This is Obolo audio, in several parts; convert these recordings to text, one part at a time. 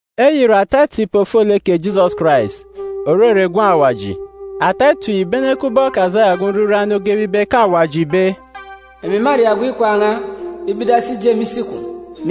Eyi ìre ata etip ofolek kè Jisọs Karais, òrere Gwun̄ Awaji. Ata etip yi ìbene kubọk Asaya ogwu nriran ogebe ibe ke Awaji ìbe, “Emi mâria gwun̄ ikwaan̄ n̄a ibe idasi ije me isi kwun̄,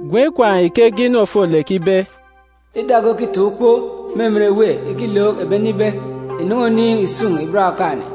Gwun̄ ikwaan̄ yi ke ege inu ofolek ibe, “Ida ge òkitaan̄ ukpo me emen èwê ikilook ebi ene ibe, ‘Ìnen̄e oniin̄ ìsun̄ ìban Okaan̄-ene,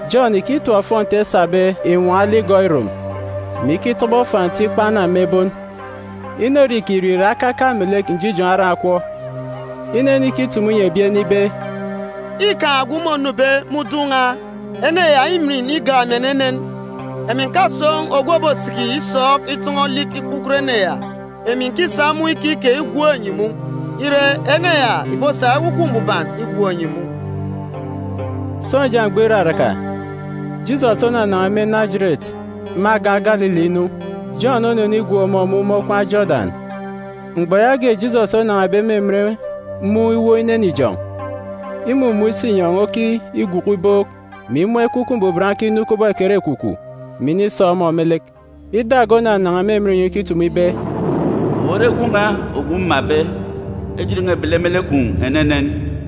Jọn ìkitap ofọnti esabe inwọọn̄ aligọ irom, mè ikitobo fanti ikpa anam me ebon. Inorie îkirie ìre akaka ituuk melek njijoon̄ aran̄ akwọọk. Inenikitumu inyi ebi ene ibe, “Îkaan̄ ogwu mônube me udun̄ n̄a. Ene ya îmin igak emi enenen. Emi ǹkasoon̄ ogwu òbosiki isọọk itọn̄ọ olik ikpukot ene ya. Emi ǹkisa mun̄ ikike igwook enyi mun̄, ire, ene ya ìbosa Ekwukwu Mbuban igwook enyi mun̄.” Sọnja mgbọ iraraka, Jisọs onanan̄a me Najeret me agan̄ Galili inu. Jọn onenigwook ọmọ mun̄ me okwaan̄ Jodan. Mgbọ yaage Jisọs onan̄abe me emen mun̄ iwook inene ijọn̄, imumun̄ isinyọn̄ okigwuku ibook, mè imun̄ Ekwukwu Mbuban okinu kubọk ekerekwukwu, mè inisọọk ọmọ me lek. Ida ge onanan̄a me inyọn̄ ikitumu ibe, “Owu ore Gwun̄ n̄a ogwu mmabe. Ejit n̄a îbele me lek kwun̄ enenen.”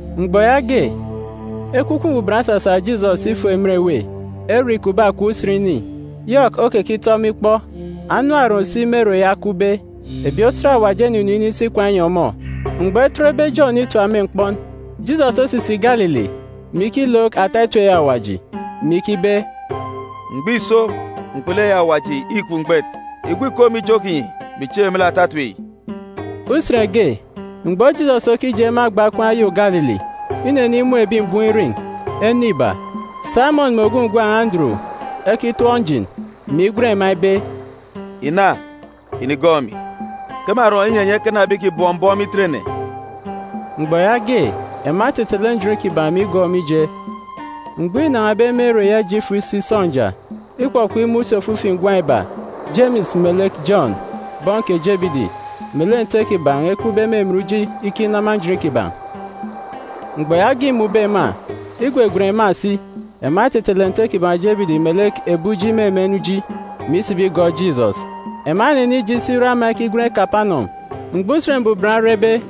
Mgbọ yaage, Ekwukwu Mbuban osasa Jisọs ifo emen èwê, ere îkupbe akọp usen ini, Yọk okekitọ ọmọ ikpọ. Ebi kè anam oron si me ere ya ekupbe. Ebi osat Awaji enunu inisi ikwaan̄ inyi ọmọ. Mgbọ etetbe Jọn itap me mkpọn, Jisọs osisi Galili, mè ikilook ata etip eyi Awaji, mè ikibe, “Mgbọ îso! Mkpulu eyi Awaji îkup mgbet! Ìgwu ìkom me ijo kinyi, mè ìchieek me lek ata etip yi.” Usen ge, mgbọ Jisọs okije me agba okwaan̄ oyô Galili, inenimun̄ ebi mbọm irin̄, ene iba, Saimọn mè ogwu ngwan̄ Anduru, ekitọp njin, mè igwen ema ibe, “Ìna, ìnigọọk emi, ke mârọ inyi enyi ekana ebi ìkibọm mbọm itet-ene.” Mgbọ yaage, ema etetele njin kiban̄ mè igọọk ọmọ ije. Mgbọ înan̄abe me ere ya ije ifo isi sọnja, ikpọkpọk imun̄ si ofifi ngwan̄ iba, Jemis melek Jọn, bọn kè Jebidi, melek nte kiban̄ ekupbe me emen uji ikinama njin kiban̄. Mgbọ yaage îmun̄be ema, igwegwen ema si. Ema etetele nte kiban̄ Jebidi melek ebi uji me emen uji, mè isibi igọọk Jisọs. Ema enenije isi ire ama ekigwen Kapanọm. Mgbọ Usen Mbuban orebe,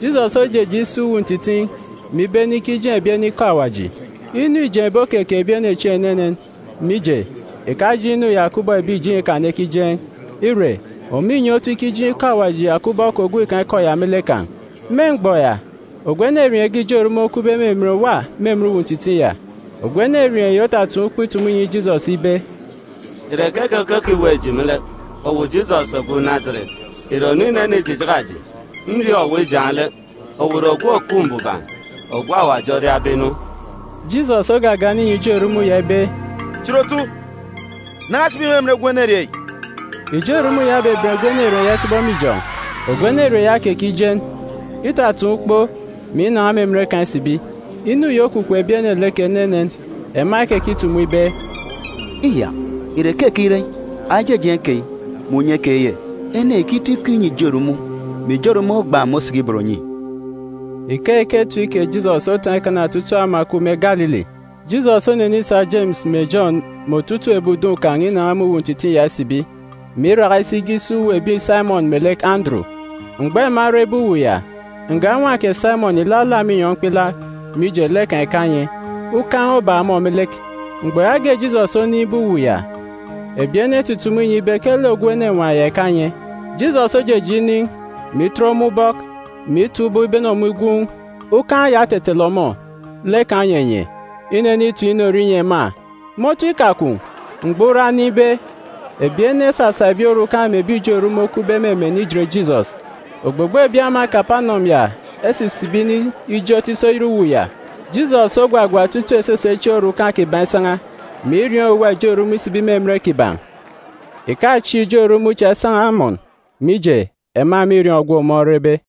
Jisọs ojeje isi uwu ntitiin̄, mè ibene ikijeen̄ ebi ene ikọ Awaji. Inu îjeen̄be okeke ebi ene chieen̄ enenen, mije, ìkajeen̄ inu ya kubọk ebi ìjeen̄ Ikan ekijeen̄. Ire, ọmọ înye otu ikijeen̄ ikọ Awaji ya kubọk ogwukaan̄ ikọ ya me lek kan̄. Me mgbọ ya, ogwu enerieen̄ ge ijo erumun̄ okupbe me emen òwa me emen uwu ntitiin̄ ya. Ogwu enerieen̄ yi otataan̄ ukpo itumu inyi Jisọs ibe, “Ìre keke ke òkiweek eji me lek, owu Jisọs ogwu Najeret? Ìre ònu inenijijaka eji? Nriọọn̄ owu ijaan̄ lek. Owu ìre Ogwu Òkup Mbuban, ogwu Awaji oriabe inu.” Jisọs ogagana inyi ijo erumun̄ ya ibe, “Chit otu! Nan̄a sibi me emen gwun̄ enerieen̄ yi!” Ijo erumun̄ ya obeben gwun̄ enerieen̄ ya itọbọ me ijọn̄. Ogwu enerieen̄ ya okekijen. Itataan̄ ukpo, mè inan̄a me emen kan̄ isibi. Inu yi okwukwu ebi ene lek enenen. Ema ekekitumu ibe, “Iyak, ìre keke ire eyi? Aya ijejeen̄ keyi, mè unye keyi ye? Ene yi ìkitọ ikọ inyi ijo erumun̄, mè ijo erumun̄ ogban̄, mè osiki ibot onyi.” Mgbọ yaage, etip kè Jisọs otataan̄ ikana otutuuk ama òkup me Galili. Jisọs onenisa Jemis mè Jọn mè otutuuk ebi udun̄ kan̄ inan̄a me uwu ntitiin̄ ya isibi, mè iraka isi ge isi uwu ebi Saimọn melek Anduru. Mgbọ ema erebe uwu ya, nga nwa kè Saimọn ìlalaak me inyọn̄ mkpilaak, mije, lek kan̄ ìkanye, ukan̄ obak ọmọ me lek. Mgbọ yaage Jisọs onin̄be uwu ya, ebi ene etutumu inyi ibe ke lek ogwu enenwaan̄ ya ìkanye. Jisọs ojeje inin̄, mè itet ọmọ ubọk, mè itap ubọk ibene ọmọ igwuun̄. Ukan̄ ya otetele ọmọ, lek kan̄ onyenye. Inenitem inorie inyi ema. Me otu ikakwun̄, mgbọ ura onimbe, ebi ene esasa ebi orukan̄ mè ebi ijo erumun̄ okupbe me emen ijet Jisọs. Ogbogbo ebi ama Kapanọm ya esisibi inijot isi oyet uwu ya. Jisọs ogwagwa otutuuk esese chieen̄ orukan̄ kiban̄ isan̄a, mè irieen̄ owuwa ijo erumun̄ isibi me emen kiban̄. Ìkachieek ijo erumun̄ cha esan̄a amọn, mije, ema mîriọọn̄ ogwu ọmọ orebe.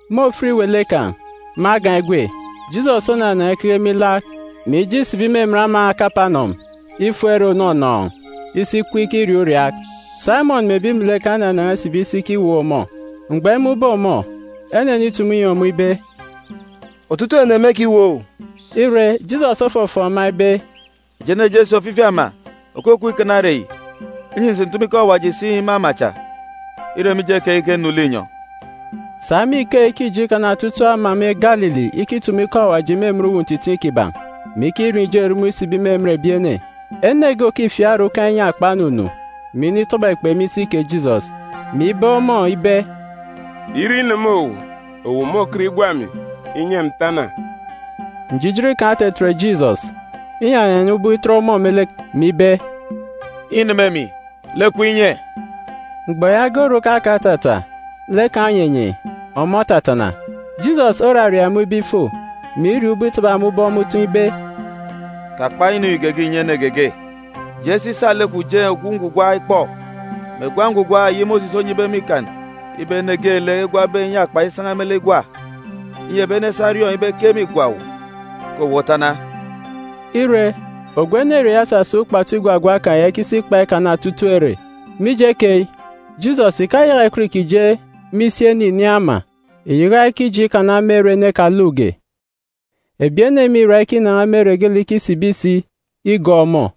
Me ofit iwele kan̄, me agan̄ egwe, Jisọs onanan̄a ikeke me ilaak, mè ije isibi me emen ama Kapanọm ifo ere ònọnọọn̄, isi ikup ikiriaak uriaak. Saimọn mè ebi melek kan̄ enanan̄a isibi isi ikiweek ọmọ. Mgbọ emun̄be ọmọ, enenitumu inyi ọmọ ibe, “Otutuuk ene mêkiweek owu.” Ire, Jisọs ofọfọọk ema ibe, “Eji eneje esi ofifi ama òkukup ikana ere yi, inyi ǹsi ǹtumu ikọ Awaji si me ama cha. Îre mije keyi ke nnu linyọn̄.” Sa me ikeyi ke îje ikana otutuuk ama me Galili ikitumu ikọ Awaji me emen uwu ntitiin̄ kiban̄, mè ikirieen̄ ijo erumun̄ isibi me emen ebi ene. Ene ge òkifiak orukan̄ inyakpa onunu, mè initọbọ ekpe me isi kè Jisọs, mè ibeek ọmọ ibe, “Ire ineme owu, owu môkọt igwa emi, inyi emi ǹtana.” Njijin kan̄ otetet Jisọs, inyanyana ubọk itet ọmọ me lek, mè ibe, “Îneme emi. Lek kwun̄ inye!” Mgbọ yaage orukan̄ kan̄ otata, lek kan̄ onyenye, ọmọ otatana. Jisọs oraria ọmọ ibe ifo, mè iriọọn̄ ubọk itaba ọmọ ubọk me utọn̄ ibe, “Kakpa inu yi geege ìnyi ene geege. Je si sa lek kwun̄ jeen̄ ogwu ngwugwa ikpọ, mè gwa ngwugwa eyi Mosis onyibe me Ikan ibe ene geelek egwabe inyakpa isan̄a me lek igwa, inyi ebi ene esa eriọọn̄ ibe ke mîgwa owu; ke owu otana.” Ire, ogwu enerieen̄ ya osasa ukpatu igwagwa kan̄ ya isi ikikpa ikana otutuuk ere. Mije keyi, Jisọs ìkayaka ìkọt ìkije me isi ene ìnin̄ ama, ìyaka ikije ikana me ere ene ekalukge. Ebi ene mîra ikinan̄a me ere geelek ikisibi si igọọk ọmọ.